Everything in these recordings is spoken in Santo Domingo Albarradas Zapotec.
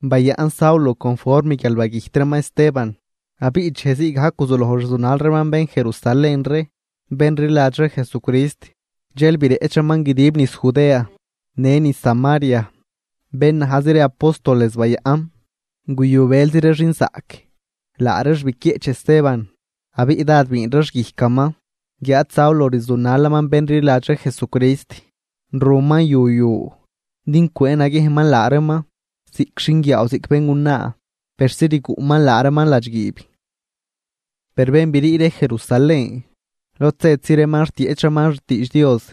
Bayaꞌn Saulo conform guial bagüjt reeman Esteban. Abiꞌ dxej zii gajc guzuloj rzunal reeman bén Jerusalén ree bén rliladx ree Jesucrist, dxel bireꞌch reeman guidib niz Judea në niz Samaria, bén najzi ree apóstoles bayaꞌn. Guyu bëlzi ree xinzaꞌc, laa reex biquieꞌch Esteban, abiꞌ dád biin reex guijcaman. Guiáad Saulo rzunalaman bén rliladx ree Jesucrist, ruman yu yu din cwëë naguiejnman laa reeman, ziꞌc xinguiaaw ziꞌc béngunaa, persi rguꞌman laa reeman ladxguiib. Per bén brii ree Jerusalén, lod zëtzi reeman rtieꞌch reeman xtiidx Dios.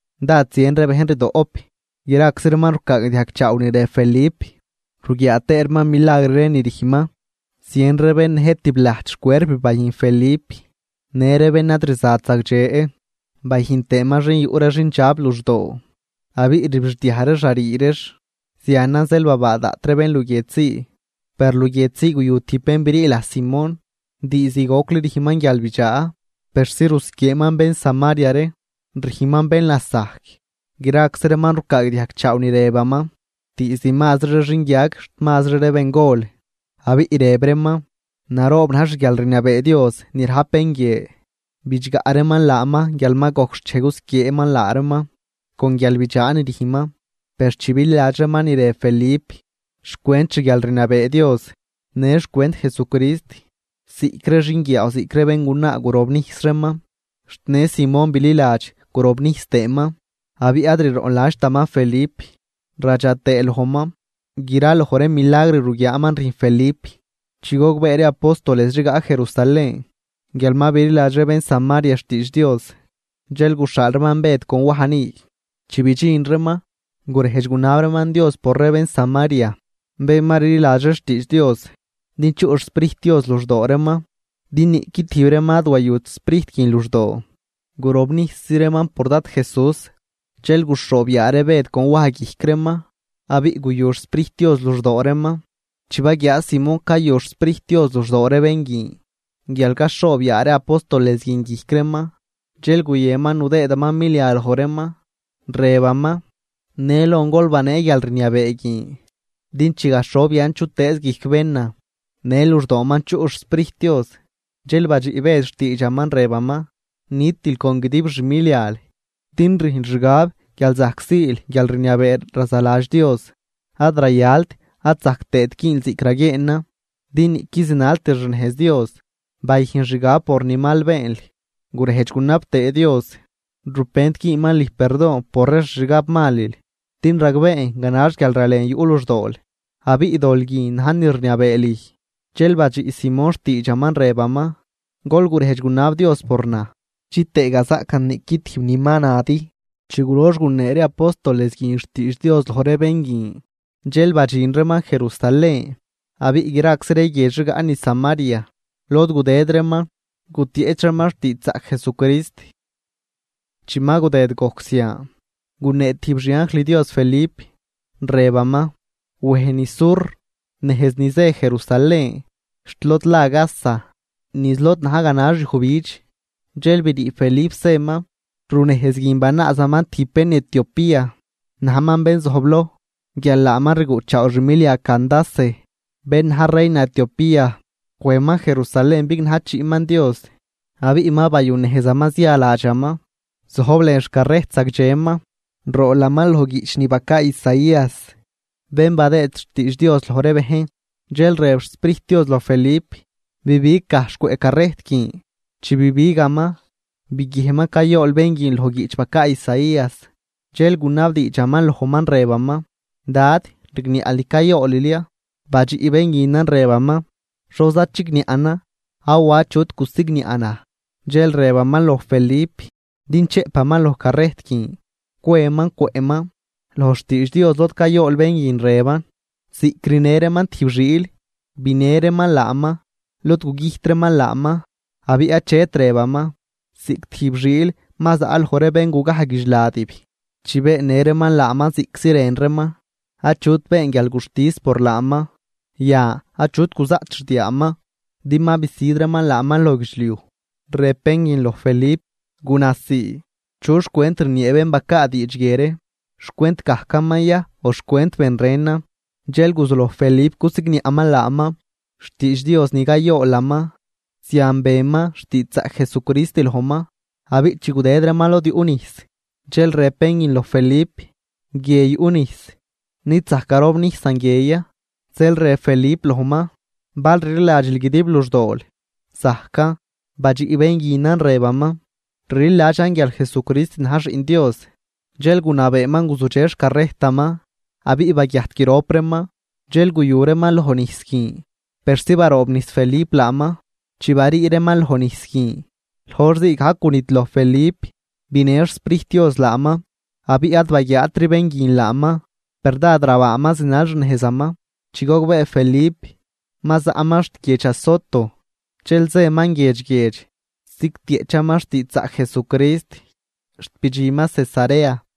Dád zien ree bejn rdoꞌp, graczi reeman rucaagdiajg chaaw ni rëb Felip, ruguiaa tëë reeman milagr ree ni rüjnman. Zien ree bén nëjt tib lajt xcuerp bayüjn Felip, në ree bén ad rzat zagdxe, bayüjn tëëman bén yuꞌ ree xindxab luxdoo abiꞌ rbixdiaj reex rarii reex. Zianan zeel babaa daꞌt ree bén luguiedx zii. Per luguiedx zii guyu tijb bén brii laj Simón, diizd gocli rüjnman guialbidxaa persi rusquieeman bén Samaria ree, rüjnman bén lasajc. Graczi reeman rucaagdiajg chaaw ni rëbaman, diizd mazri ree xinguiag xt mazri ree bengol, abiꞌ rëb reeman: ―Naroob na̱j xguialrniabee Dios ni rajp bén guie. Bidxgaꞌ reeman laaman guial ma gojc xchej cusquieeman laa reeman con guialbidxaa ni rüjnman. Per chi bililadx reeman ni rëb Felip xcwent xguialrniabee Dios në xcwent Jesucrist, ziꞌc ree xinguiaaw ziꞌc ree béngunaa gurobnijs reeman. Xt në Simón bililadx gurobnijs tëëman, abiꞌ ad riroꞌnladxtaman Felip radxa tëë lojman graloj ree milagr ruguiaaman rüjn Felip. Chi gogbee ree apóstoles rigaꞌ Jerusalén guial ma bililadx ree bén Samaria xtiidx Dios, dxel guxhaal reeman Bëd con Waj ni. Chi bidxin reeman, gurejdx gunab reeman Dios por ree bén Samaria bén ma rliladx ree xtiidx Dios din chuꞌ xSprijt Dios luxdoo reeman, din niꞌqui tijb reeman ad wayut Sprijt guin luxdoo, gurobnijsi reeman por Dad Jesús. Dxel guxhoob yaa ree Bëd con Waj guijc reeman, abiꞌ guyu xSprijt Dios luxdoo reeman. Chi baguiaa Simón cayu xSprijt Dios luxdoo ree bén guin guial caxhoob yaa ree apóstoles guin guijc reeman, dxel guyënman nudëëman milia loj reeman, rëbaman: ―Në lon gol banee guialrniabee guin din chi gaxhob yan chutëëz guijc bénan, në luxdooman chuꞌ xSprijt Dios. Dxel badxiꞌ Bëd xtiidxaman rëbaman: ―Nitil con guidib xmilial, din rüjnl xgab guial zajc siil guialrniabee razaladx Dios. Ad rayalt ad zajc tëët güünl ziꞌc raguieenan, din niꞌquid zinaltil xnejz Dios. Bayüjn xgab por ni mal beenl, gurejdx gunab tëë Dios, rupent güünman lüj perdon por ree xixgabmalil, din ragbeen ganax guialralen yuꞌ luxdool, abiꞌ dol guin na̱j ni rniabee lüj. Dxel badxiꞌ Simón xtiidxaman, rëbaman: ―Gol gurejdx gunab Dios por naj, chitëë gazaꞌcan niꞌqui tijb ni ma nadi. Chi gulox gunee ree apóstoles guin xtiidx Dios loj ree bén guin, dxel badxin reeman Jerusalén, abiꞌ graczi ree guiedx rigaꞌ niz Samaria lod gudëd reeman gutieꞌch reeman xtiidxzaꞌc Jesucrist. Chi ma gudëd gojc zian, gunee tijb xi anjl Dios Felip rëbaman: ―Wej niz sur nejz ni zë Jerusalén xt lod la Gaza, niz lod na̱j ganax yujbidx. Dxel brii Felip zëman. Runejz guin banaazaman tijb bén Etiopía, najman bén zojbloj guial laaman rguꞌchaaw xmilia Candace, bén na̱j reina Etiopía. Wejman Jerusalén bignajchiꞌman Dios, abiꞌ ma bayunejzaman zia ladxaman, zojb lën xcarrejt zagdxeman, roolaman loj guiꞌch ni bacaa Isaías, bén badëëd xtiidx Dios loj ree bejn. Dxel rëb xSprijt Dios loj Felip: ―Bibig gajxh cwëꞌ carrejt guin. Chi bibigaman, biguiejnman cayool bén guin loj guiꞌch bacaa Isaías. Dxel gunabdiidxaman lojman rëbaman: ―Dad, ¿rigniaꞌl ni cayoolil ya? Badxiꞌ bén guinan rëbaman: ―¿Xoza chigniaꞌnan? Awa achut gusigniaꞌ naj. Dxel rëbaman loj Felip din chëꞌpaman loj carrejt guin, cweman cwëꞌman. Loj xtiidx Dios lod cayool bén guin rëban: Ziꞌc rinë reeman tijb xiil, binë reeman laaman lod gugüjt reeman laaman. Abiꞌ achet rëbaman, ziꞌc tijb xiil ma zaꞌ loj ree bén gugaj guidxladib. Chi beennë reeman laaman ziꞌctzi rën reeman, achut been guialguxtis por laaman. Yan achut guzaꞌt xdiaaman, din ma bisüd reeman laaman loj guidxliuj. Rëb bén guin loj Felip: ―Guna sii, ¿chu xcwent rniee bén bacaa diidx guie ree? ¿Xcwent gajcaman ya o xcwent ben renan? Dxel guzuloj Felip cusigniaꞌman laaman xtiidx Dios ni cayoolaman, zian beman xtiidxzaꞌc Jesucrist lojman. Abiꞌ chi gudëd reeman lod yuꞌ nijs, dxel rëb bén guin loj Felip: ―Guie yuꞌ nijs. ¿Nid zajc garobnijsan guie ya? Zeel rëb Felip lojman: ―Bal rliladxil guidib luxdool, zajcan. Badxiꞌ bén guinan rëbaman: ―Rliladxan guial Jesucrist na̱j Xiꞌn Dios. Dxel gunabeeman guzudxe xcarrejtaman. Abiꞌ baguiajt grop reeman, dxel guyu reeman lojnijs guin persi baroobnijs Felip laaman. Chi barii reeman lojnijs guin, loj hor zii gajc gunidloj Felip binë xSprijt Dios laaman, abiꞌ ad baguiaatri bén guin laaman, per dád rabaaman zinal xnejzaman. Chi gogbee Felip, ma zaꞌman xt guiedx Azoto, dxel zëman guiedx guiedx zigtieꞌchaman xtiidxzaꞌc Jesucrist xt bidxinman Cesarea.